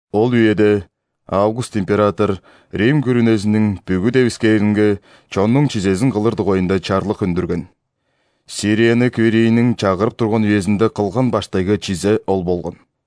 Ол үеде Август император Рим күрүнезиниң бүгү девискээринге чоннуң чизезин кылыр дугайында чарлык үндүрген. Сирияны Квиринийниң чагырып турган үезинде кылган баштайгы чизе ол болган.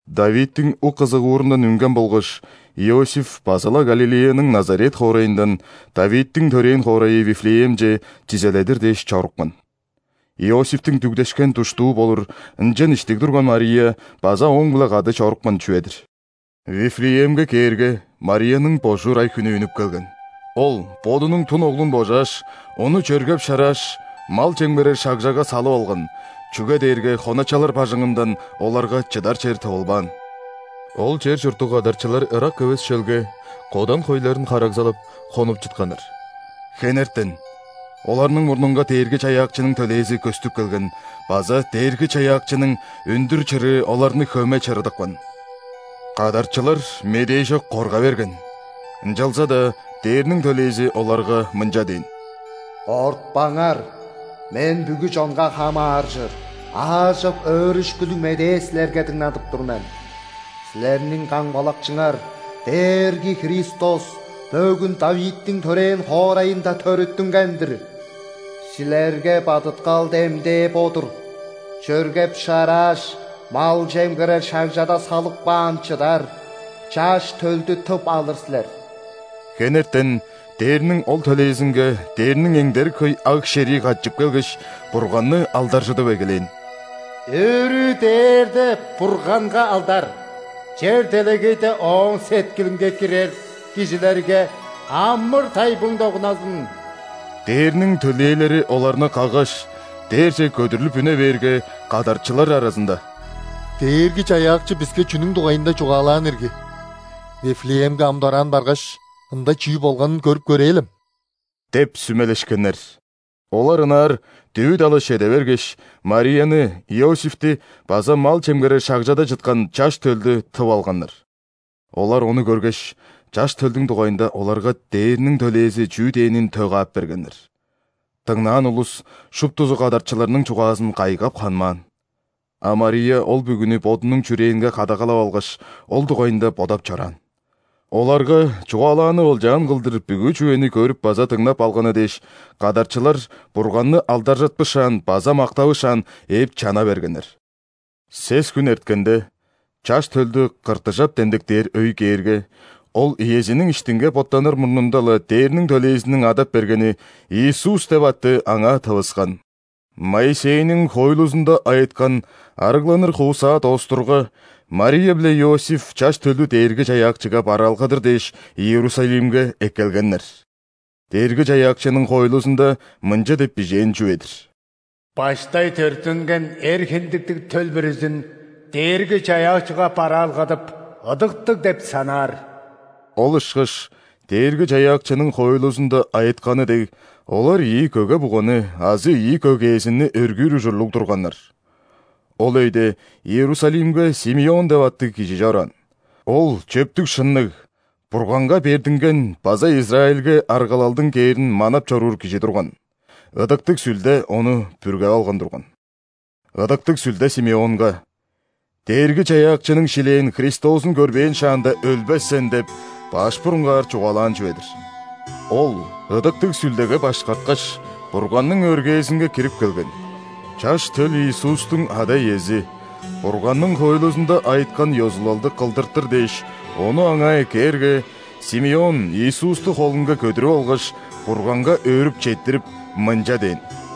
·Давидтиң ук-ызыгуурундан үнген болгаш, Иосиф база-ла Галилеяның Назарет хоорайындан Давидтиң төрээн хоорайы Вифлеемче чизеледир дээш чорупкан. Иосифтиң дүгдешкен душтуу болур, ынчан иштиг турган Мария база ооң-биле кады чорупкан чүве-дир. Вифлеемге кээрге, Марияның божуур ай-хүнү үнүп келген. Ол бодунуң дун Оглун божааш, Ону чөргеп-шарааш, мал чемгерер шагжага салып алган, чүге дээрге хоначалар бажыңындан оларга чыдар чер тывылбаан. Ол чер чурттуг кадарчылар ырак эвес шөлге, кодан хойларын харагалзап, хонуп чытканнар. Хенертен оларның мурнунга Дээрги-Чаяакчының төлээзи көстүп келген база Дээрги-Чаяакчының өндүр чырыы оларны хөме чырыдыпкан. Кадарчылар медээжок корга берген, ынчалза-даа дээрниң төлээзи оларга мынча дээн: «Кортпаңар. Мен бүгү чонга хамааржыр аажок өөрүшкүлүг Медээ силерге дыңнадып тур мен. Силерниң Камгалакчыңар, Дээрги Христос бөгүн ·Давидтиң төрээн хоорайында төрүттүнген-дир! Силерге бадыткал демдээ бо-дур: чөргеп-шарааш, мал чемгерер шагжада салып каан чыдар Чаш төлдү тып алыр силер». Хенертен дээрниң ол төлээзинге дээрниң эңдерик хөй аг-шерии катчып келгеш, Бурганны алдаржыдып эгелээн: «Өрү дээрде Бурганга алдар! Чер-делегейде Ооң сеткилинге кирер кижилерге амыр-тайбың догунназын!» Дээрниң төлээлери оларны каггаш, дээрже көдүрлүп үне бээрге, кадарчылар аразында: «Дээрги-Чаяакчы биске чүнүң дугайында чугаалаан ирги, Вифлеемге ам дораан баргаш, ында чүү болганын көрүп көрээлем» – деп сүмелешкеннер. Олар ынаар дүвү-далаш чеде бергеш, Марияны, Иосифти база мал чемгерер шагжада чыткан Чаш төлдү тып алганнар. Олар Ону көргеш, Чаш төлдүң дугайында оларга дээрниң төлээзи чүү дээнин тө каап бергеннер. Дыңнаан улус шуптузу кадарчыларның чугаазын кайгап ханмаан. А Мария ол бүгүнү бодунуң чүрээнге кадагалап алгаш, ол дугайында бодап чораан. Оларга чугаалааны олчаан кылдыр бүгү чүвени көрүп база дыңнап алганы дээш, кадарчылар Бурганны алдаржытпышаан база мактавышаан, ээп чана бергеннер. Сес хүн эрткенде, Чаш төлдү ·кыртыжап демдектээр өй кээрге, Ол иезиниң иштинге боттаныр мурнунда-ла дээрниң төлээзиниң адап бергени Иисус деп атты Аңаа тывыскан. Моисейниң хоойлузунда айыткан ·арыгланыр хуусаа доостурга, Мария биле Иосиф Чаш төлдү Дээрги-Чаяакчыга бараалгадыр дээш, Иерусалимге эккелгеннер. Дээрги-Чаяакчының хоойлузунда мынча деп бижээн чүве-дир: «Баштай төрүттүнген эр хиндиктиг төл бүрүзүн Дээрги-Чаяакчыга бараалгадып, ыдыктыг деп санаар». Ол ышкаш Дээрги-Чаяакчының хоойлузунда айытканы дег, олар ийи көге-буганы азы ийи көгээзинни өргүүр ужурлуг турганнар. Ол өйде Иерусалимге Симеон деп аттыг кижи чораан. Ол чөптүг-шынныг, Бурганга бердинген база Израильге аргалалдың кээрин манап чоруур кижи турган. Ыдыктыг Сүлде ону бүргеп алган турган. Ыдыктыг Сүлде Симеонга: «Дээрги-Чаяакчының шилээн Христозун көрбээн шааңда өлбес сен» – деп баш бурунгаар чугаалаан чүве-дир. Ол Ыдыктыг Сүлдеге башкарткаш, Бурганның өргээзинге кирип келген. Чаш төл Иисустуң ада-иези Бурганның хоойлузунда айыткан ёзулалды кылдыртыр дээш, Ону аңаа эккээрге, Симеон Иисусту холунга көдүрүп алгаш, Бурганга өөрүп четтирип, мынча дээн: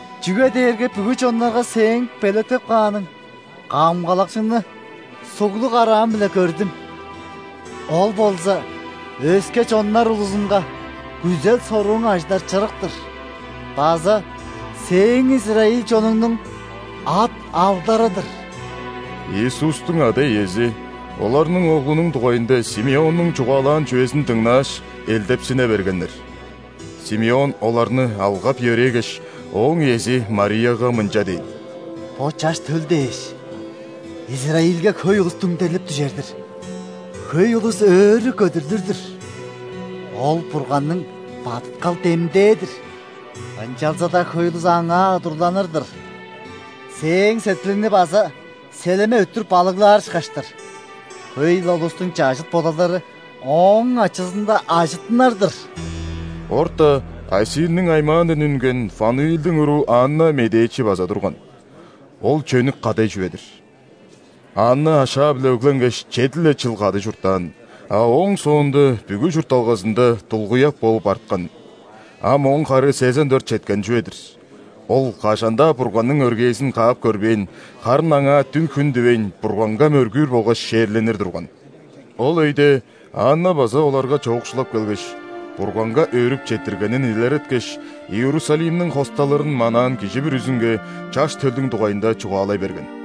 Чүге дээрге бүгү чоннарга Сээң белеткеп кааның Камгалакчыны суглуг караам-биле көрдүм. Ол болза өске чоннар улузунга күзел-сорууң ажыдар чырык-тыр база Сээң израиль чонуңнуң ат-алдары-дыр». Иисустуң ада-иези оларның Оглунуң дугайында Симеоннуң чугаалаан чүвезин дыңнааш, элдепсине бергеннер. Симеон оларны алгап-йөрээгеш, Ооң иези Марияга мынча дээн: «Бо Чаш төл дээш, Израильге хөй улус дүңдерлип дүжер-дир, хөй улус өрү көдүрлүр-дүр. Ол – Бурганның бадыткал демдээ-дир, ынчалза-даа хөй улус Аңаа удурланыр-дыр. Сээң сеткилиңни база селеме өттүр балыглаар ышкаш-тыр. Хөй-ле улустуң чажыт бодалдары Ооң ачызында ажыттынар-дыр». Орта Асирниң аймаандан үнген Фануилдиң уруу Анна медээчи база турган. Ол чөнүк кадай чүве-дир. Анна ашаа-биле өгленгеш, чеди-ле чыл кады чурттаан, а ооң соонда бүгү чуртталгазында дулгуяк болуп арткан. Ам ооң хары сезен дөрт четкен чүве-дир. Ол кажан-даа Бурганның өргээзин каап көрбээн, харын аңаа дүн-хүн дивейн, Бурганга мөргүүр болгаш ·шээрленир турган. Ол өйде Анна база оларга чоокшулап келгеш, Бурганга өөрүп четтиргенин илереткеш, Иерусалимниң хосталырын манаан кижи бүрүзүнге Чаш төлдүң дугайында чугаалай берген.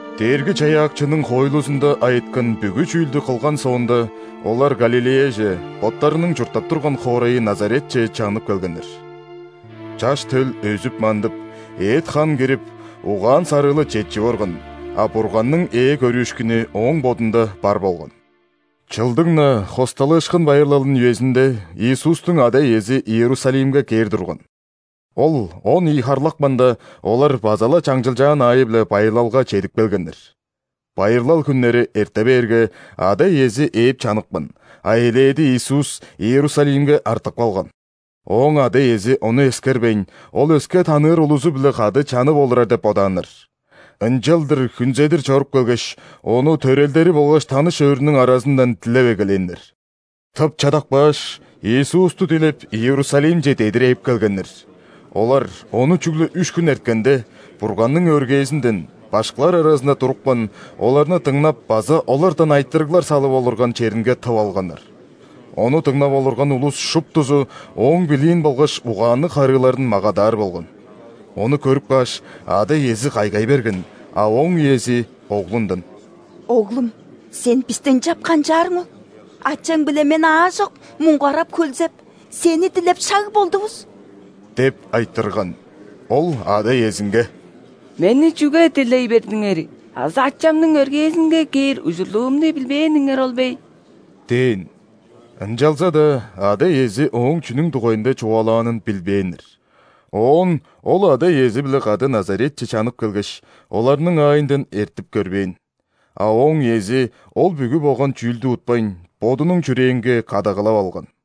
Дээрги-Чаяакчының хоойлузунда айыткан бүгү чүүлдү кылган соонда, олар Галилеяже, боттарының чурттап турган хоорайы Назаретче чанып келгеннер. Чаш төл өзүп-мандып, эът-хан кирип, угаан-сарыылы четчип орган, а Бурганның ээ көрүүшкүнү Ооң Бодунда бар болган. Чылдың-на ·Хосталыышкын байырлалының үезинде Иисустуң ада-иези Иерусалимге кээр турган. Ол он ийи харлапканда, олар база-ла чаңчылчаан аайы-биле байырлалга чедип келгеннер. Байырлал хүннери эрте бээрге, ада-иези ээп чаныпкан, а элээди Иисус Иерусалимге артып калган. Ооң ада-иези ону эскербейн, Ол өске таныыр улузу-биле кады чанып олурар деп бодааннар. Ынчалдыр хүнзедир чоруп келгеш, Ону төрелдери болгаш таныш өөрүнүң аразындан дилеп эгелээннер. Тып чадап кааш, Иисусту дилеп, Иерусалимче дедир ээп келгеннер. Олар Ону чүгле үш хүн эрткенде, Бурганның өргээзинден, башкылар аразында турупкан, оларны дыңнап база олардан айтырыглар салып олурган черинге тып алганнар. Ону дыңнап олурган улус шуптузу Ооң билиин болгаш угаанныг харыыларын магадаар болган. Ону көрүп кааш, ада-иези кайгай берген, а Ооң иези Оглундан: «Оглум! Сен бисти ынчап канчаарың ол? Ачаң биле мен аажок муңгарап-хөлзеп, Сени дилеп шаг болдувус» – деп айтырган. Ол ада-иезинге: «Мени чүге дилей бердиңер? Азы Ачамның өргээзинге кээр ужурлуумну билбээниңер ол бе?» – дээн. Ынчалза-даа ада-иези Ооң чүнүң дугайында чугаалаанын билбээннер. Оон Ол ада-иези-биле кады Назаретче чанып келгеш, оларның аайындан эртип көрбээн. А Ооң иези ол бүгү болган чүүлдү утпайн, бодунуң чүрээнге кадагалап алган.